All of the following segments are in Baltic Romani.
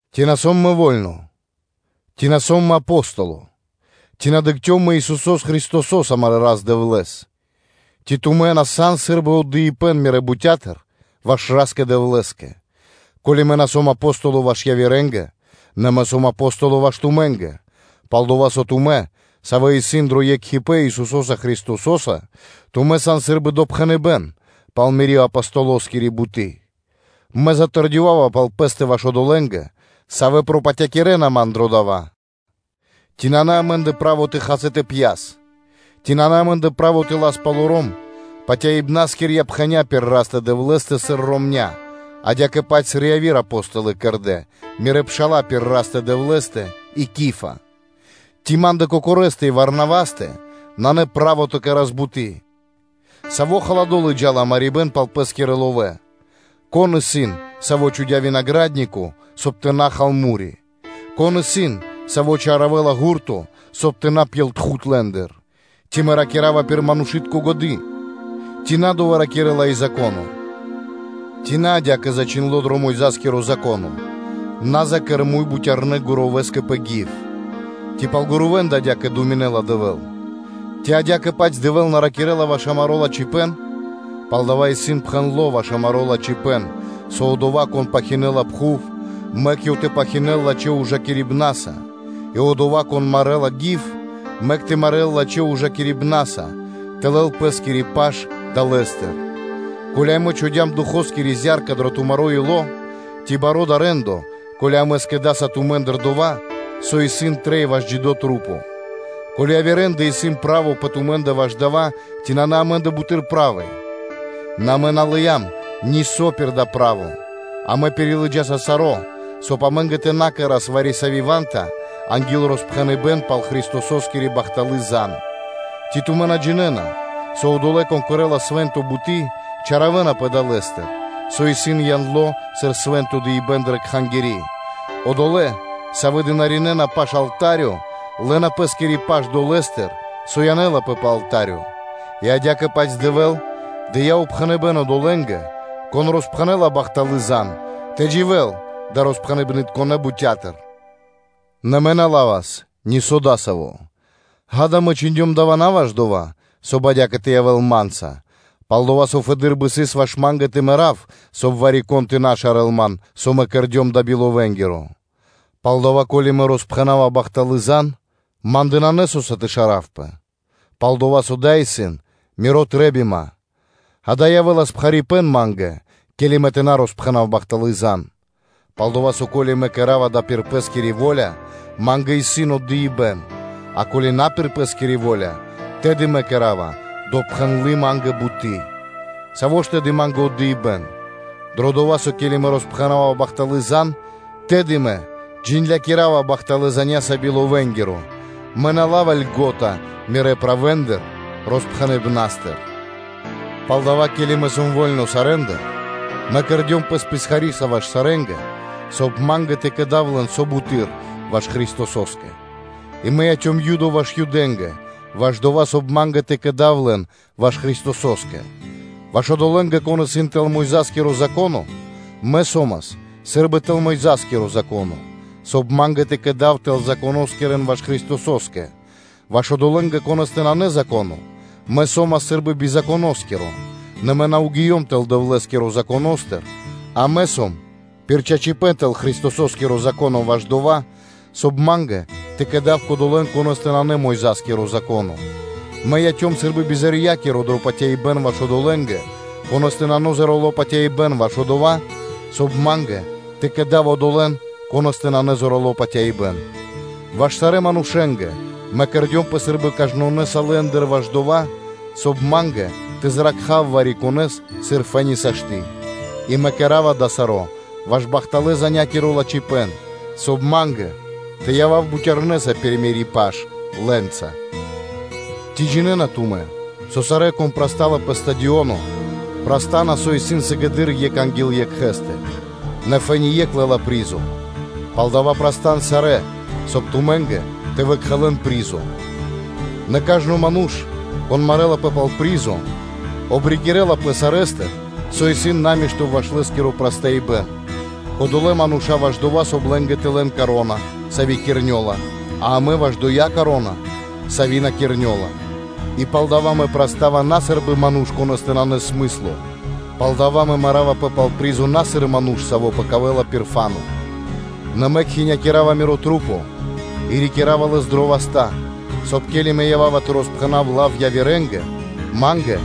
Ци на сом мэ во́льно? Ци на сом мэ Апостоло? Ци на дыкхцём мэ Исусо́с Христосо́с, амарэ́ Рас-Дэвлэ́с? Ци тумэ́ на сан сы́рбы отдыибэ́н мирэ́ бутя́тыр ваш Ра́скэ-Дэвлэ́скэ? Ко́ли мэ на сом Апостоло ваш явирэ́нгэ, нэ мэ сом Апостоло ваш тумэ́нгэ; пал-дова́ со тумэ́, савэ́ исын дро екхипэ́н Исусо́са Христосо́са, тумэ́ сан сы́рбы допхэныбэ́н пал мири́ Апостолоскири буты́. Мэ затэрдёвава пал пэ́стэ ваш одолэ́нгэ, савэ́ пропатякирэна ман дро дава́: “Ци нанэ амэ́ндэ право тэ хас и тэ пьяс? Ци нанэ амэ́ндэ право тэ лас палоро́м патяибнаскирья пхэня́ пир Растэ-Дэвлэ́стэ сыр ромня́, адя́кэ-паць сыр яви́р Апо́столы кэрдэ́, мирэ́ пша́ла, пир Растэ-Дэвлэ́стэ, и Кифа? Ци ма́ндэ кокорэстэ и Варнавастэ нанэ право тэ на кэра́с буты́? Саво́ халадо (рулдо) лыджа́ла марибэ́н пал пэ́скирэ ловэ́? Кон исын, саво́ чхудя́ винагра́днико, соб (кай) тэ на хал му́ри? Кон исын, саво́ чаравэла гурто, соб (кай) тэ на пьел тхуд лэ́ндыр? Ци мэ ракира́ва пир манушы́тко годы́? Ци на дова́ ракирэ́ла и Зако́но? Ци нанэ адя́кэ зачхиндло́ дро Мойза́скиро (Моисеёскиро) Зако́но: “На закэр муй бутярнэ́ гурувэскэ пэ гив.” Ци пал гурувэндэ адя́кэ думинэ́ла Дэвэ́л? Ци адя́кэ-паць Дэвэ́л на ракирэ́ла ваш амаро́ лачхипэ́н? Палдава́ исын пхэндло́ ваш амаро́ лачхипэ́н, со одова́, кон пахинэла (пхаравэла) пхув, мэк ёв тэ пахинэл лачхэ́ ужакирибнаса, и одова́, кон марэла гив, мэк тэ марэл лачхэ́ ужакирибнаса тэ лэл пэ́скири паш далэ́стыр. Ко́ли амэ чхудям Духоскири зя́рка дро тумаро́ ило́, ци баро́ исын дава́ рэ́ндо (де́ло), ко́ли амэ скэдаса тумэ́ндыр дова́, со исын трэй ваш джидэ́ маса́? Ко́ли явирэндэ исын право пэ тумэ́ндэ ваш дава́, ци нанэ амэ́ндэ буты́р правы? Нэ амэ на лыям нисо́ пир дава́ право, а амэ пирилыджаса саро́, соб (кай) амэ́нгэ тэ на кэра́с вари-сави́ ва́нта анги́л роспхэныбэн пал Христососкири бахталы́ зан (звесь). Ци тумэ́ на джинэ́на, со одолэ́, кон кэрэ́ла свэ́нто буты́, чалякирэнапэ далэ́стыр, со исын яндло сыр свэ́нто дыибэ́н дрэ Кхангири́; одолэ́, савэ́ дынаринэна пашы́л алта́рё, лэ́на пэ́скири паш долэ́стыр, со янэлапэ пэ алта́рё. И адя́кэ-паць Дэвэ́л дыя́ упхэныбэ́н одолэ́нгэ, кон роспхэнэ́ла бахталы́ зан (звесь), тэ дживэ́н далэ́ бутя́тыр, со ёнэ кэрэ́на. Нэ мэ на́ ла́вас нисо́ дасаво. Ѓа́да, мэ чхиндём дава́ на ваш дова́, соб (кай) адя́кэ тэ явэ́л ма́нца; пал-дова́ со фэды́р бы сыс ваш ма́нгэ тэ мэрав, соб (кай) вари-кон тэ на шарэл ман, со мэ кэрдём дава́ би ловэнгиро. Палдава́, ко́ли мэ роспхэнава бахталы́ зан (звесь), ма́ндэ нанэ со́са тэ шаравпэ; пал-дова́ со дава́ исын мири́ трэ́бима; дава́ явэ́лас пхарипэ́н ма́нгэ, ке́ли мэ тэ на роспхэнав бахталы́ зан (звесь). Пал-дова́ со, ко́ли мэ кэра́ва дава́ пир пэ́скири во́ля, ма́нгэ исын отдыибэ́н, а ко́ли на пир пэ́скири во́ля, тэды мэ кэра́ва допхэндлы ма́нгэ буты́. Саво́ ж тэды ма́нгэ мазу́ри (награда)? Дро дова́, со ке́ли мэ роспхэнава бахталы́ зан (звесь), тэды мэ джиндлякирава бахталэ́ заня́са би ловэнгиро, мэ на лава́ льго́та мирэ́ правэндыр роспхэныбнастыр. Палдава́, ке́ли мэ сом во́льно сарэ́ндыр, мэ кэрдём пэс писхариса ваш сарэ́нгэ, соб (кай) ма́нгэ тэ кэдав лэн со буты́р ваш Христосо́скэ. И мэ яцём Юдоса ваш Юдэ́нгэ ваш дова́, соб (кай) ма́нгэ тэ кэдав лэн ваш Христосо́скэ: ваш одолэ́нгэ, кон исын тэл Мойза́скиро Зако́но, мэ со́мас сы́рбы тэл Мойза́скиро (Моисеёскиро) Зако́но, соб (кай) ма́нгэ тэ кэдав тэл-Законоскирэн ваш Христосо́скэ: ваш одолэ́нгэ, конэ́стэ нанэ Зако́но, мэ со́мас сы́рбы би Законоскиро (нэ мэ на гиём тэлэ́ Дэвлэ́скиро Законо́стыр, а мэ сом пир чачипэ́н тэл Христосо́скиро Зако́но) ваш дова́, соб (кай) ма́нгэ тэ кэдав кодолэ́н, конэ́стэ нанэ Мойза́скиро Зако́но. Мэ яцём сы́рбы бизорья́киро дро патяибэ́н ваш одолэ́нгэ, конэ́стэ нанэ зорало́ патяибэ́н ваш одова́, соб (кай) ма́нгэ тэ кэдав одолэ́н, конэ́стэ нанэ зорало́ патяибэ́н. Ваш сарэ́ манушэ́нгэ мэ кэрдёмпэ сы́рбы кажнонэса лэ́ндыр ваш дова́, соб (кай) ма́нгэ тэ зракхав вари-конэ́с, сыр фэ́ни сашты́. И мэ кэра́ва дава́ саро́ ваш бахталэ́-занякиро лачхипэ́н, соб (кай) ма́нгэ тэ явав бутярнэса пир мири́ паш лэ́нца. Ци джинэ́на тумэ́, со сарэ́, кон прастала пэ стадионо, праста́на со исын сыгэды́р екх анги́л екхэ́стэ, нэ фэ́ни екх лэ́ла призо. Палдава́, прастан сарэ́, соб (кай) тумэ́нгэ тэ выбашавэн призо. Нэ кажно ману́ш, кон марэлапэ пал призо, обрикирлапэ сарэ́стыр, со исын намишто ваш лэ́скиро прастаибэн: кодолэ́ мануша́ ваш дова́, соб (кай) лэ́нгэ тэ лэн вя́нка (коро́на), сави́ кирнёла, а амэ ваш кодоя вя́нка, сави́ на кирнёла. И палдова́ мэ прастава на сы́рбы ману́ш, конэ́скэ нанэ смысло, палдава́ мэ маравпэ пал призо на сыр ману́ш, саво́ пэкавэла пир фа́но (воздухо). Нэ мэ кхинякирава мирэ́ маса́ и рикирава лэс дрэ васта́, соб (кай) ке́ли мэ ява́ва тэ роспхэнав бахталы́ зан явирэ́нгэ, ма́нгэ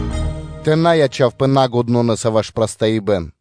тэ на ячавпэ налачхэса ваш прастаибэн.